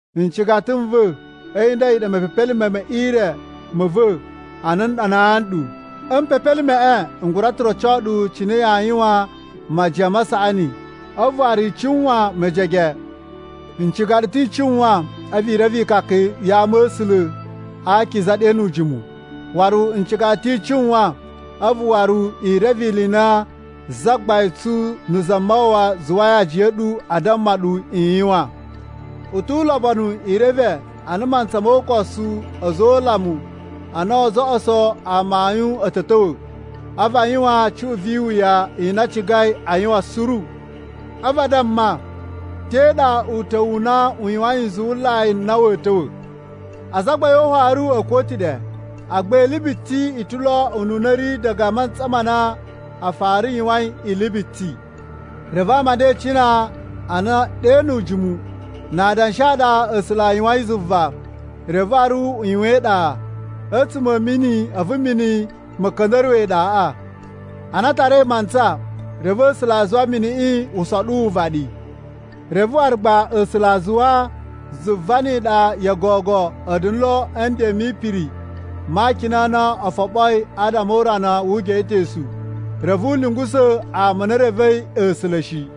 Ncigata n va̱, a̱yi nda a̱yi ɗa mepepelime me ire ma̱ va̱ a na n ɗanaa nɗu. A̱ mpepelimeꞌe n gura ta̱ roco ɗu cine yaa yuwan majiyan ma saꞌani, a̱vu waru i cuwan mejege. N ciga ɗu ta̱ i cuwan a̱vu i reve ikaka ya ama̱sula̱ a akiza ɗe nu ujimu, waru n ciga ɗu ta̱ i cuwan a̱vu waru i reve ili i na Zagbain tsu na̱ Zamawawa zuwai ajiya a̱ ɗu a damma ɗu i yuwan. U tu ulobonu i reve a na a mantsa mo ukosu a̱za̱ o ulamu a na oo zoꞌoso amayun a̱ ta̱ ta̱wa̱, a̱vu a yuwan cuꞌun vi iwuya i na a cigai a yuwan suru. A̱vu a damma, “Te ɗa uta̱wu u na u yuwain nzuwulai n na wa̱a̱ ta̱wa̱? Azagbain o ufaru a̱ kuwa̱ ta̱ ɗe, agba ili biti i ta̱ lo ununa a̱ ri diga a mantsa ma na a fara yuwain ili biti.” Reve ama a nda e icina a na ɗe nu ujimu, na adanshi a ɗa A̱sula̱ a yuwain zuva. Reve waru a yuwan iɗa a̱tsuma̱ a̱ mini a̱vu mini ma̱ ka̱nda̱ruwa̱ iɗaꞌa. Ana a tarai mantsa, reve A̱sula̱ a zuwa miniꞌi u soɗu uvaɗi. Reve waru gba A̱sula̱ a zuwa zuva ni iɗa yo gogo a̱ da̱na̱ lo a̱ nden mi ipiri ma akina a na o foɓoi adama o urana wu ugeꞌetosu, reve u lungusa̱ ama a na e revei A̱sula̱ shi.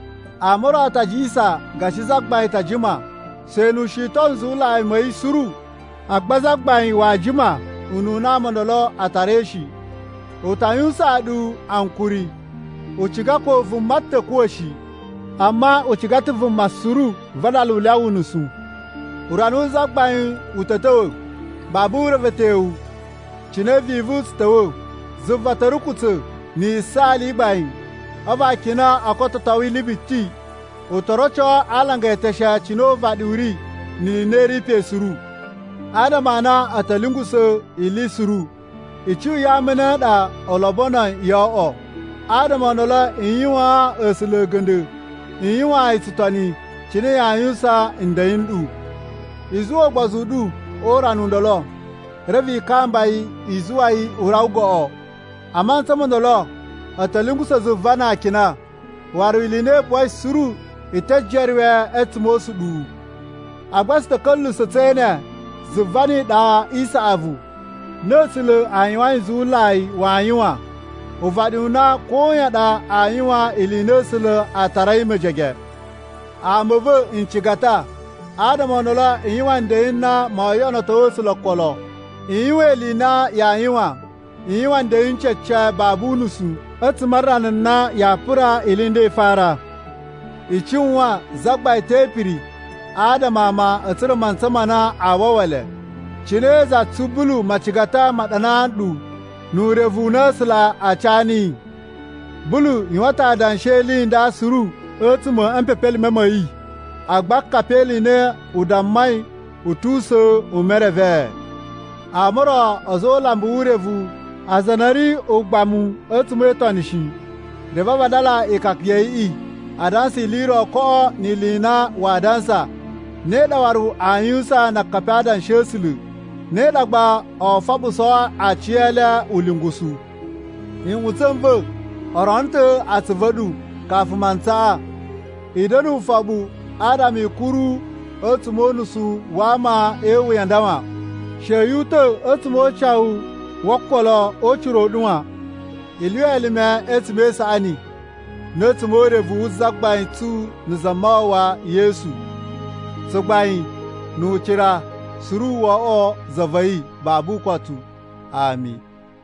Ama o ro a ta jiyasan gashi Zagbain ta jima, she nu u shiton nzuwulai ma̱ yi suru. Agba Zagbain waa jima ununa ama o ndolo a tarai shi, u ta yuwusaan ɗu ankuri. U ciga ko vuma ta̱ kuwa̱ shi, amma u ciga ta̱ vuma suru vadala u lyawa unusu. Urana wu Zagbain u ta̱ ta̱wa̱ babu urevetyowu, cine vivu tsu ta̱wa̱. Zuva ta̱ rukutsa̱ na̱ yisaali i gbain, a̱vu akina o kototo ili biti. U to roco a alanga eteshe cine uvaɗi u ri ni ili i na i ri pe suru. Adama a na a̱ ta̱ lungusa̱ ili suru, icuꞌun ya ama a̱ ne a ɗa u lobonoi yo oꞌwo? Adama o ndolo i yuwaan A̱sula̱ a̱ga̱nda̱, i yuwaan yi tsutoni cine yaa yuwusan nden n ɗu. I zuwa ugbozu u ɗu o urana u ndolo, reve i kamba yi i zuwa yi u rawa goꞌo. A mantsa mo ndolo a̱ ta̱ lungusa̱ zuva na akina, waru ili i na i buwai suru i te jeruwe a̱tsuma̱ o usuɗuwu. Agba tsu ta̱ ka̱lyuwusa̱ tse ene zuva ni iɗa i saꞌavu na A̱sula̱ a yuwain nzuwulai waa yuwan, uvaɗi u na koyan ɗa aa yuwan ili i na A̱sula̱ a tarai mejege. Ama a̱ va̱ ncigata, adama o ndolo i yuwan nden n na moo yoꞌonoto A̱sula̱ okolo, i yuwan ili i na yaa yuwan, i yuwan nden cece babu unusu a̱tsuma̱ a rana na yaa pura ili i nda i fara. I cuwan, Zagbain te ipiri adama ama a̱ tsura̱ mantsa ma na a wawa le, cine za tsu Bulu macigata ma ɗanaa nɗu nu urevu u na A̱sula̱ a ca niyi. Bulu yuwan ta̱ adanshi e ili i nda suru a̱tsuma̱ a̱ mpepelime ma̱ yi. Agba akapi e ili i na u dammai a̱ tu usa̱n u merevee. Ama o ro a̱za̱ o ulambu wu urevu aza a na a̱ ri ugbamu a̱tsuma̱ e itoni shi, reve a vadala ikaka ya̱ yiꞌi a dansa ili i ro koꞌo ni ili i na waa dansa. Ne ɗa waru a yuwusan na akapi a Adanshi a̱ A̱sula̱. Ne ɗa gba oo foɓusoo aciyele ulungusu. Nꞌutsa̱ n va̱, o rono ta̱ atsuvu a̱ ɗu kafu mantsaꞌa! I da̱na̱ ufoɓu adama i kuru a̱tsuma̱ o unusu wa ama e iwuya a nda wan. She yu uta̱ a̱tsuma̱ o ucawu wo okolo o ucira u ɗu wan. I lyuwa elime a̱tsuma̱ e isaꞌani na̱ a̱tsuma̱ o urevu wu Zagbain tsu na̱ Zamawawa Yesu. Tsugbain nu ucira suru wo oꞌwo za va̱ yi babu ukotu. Ami.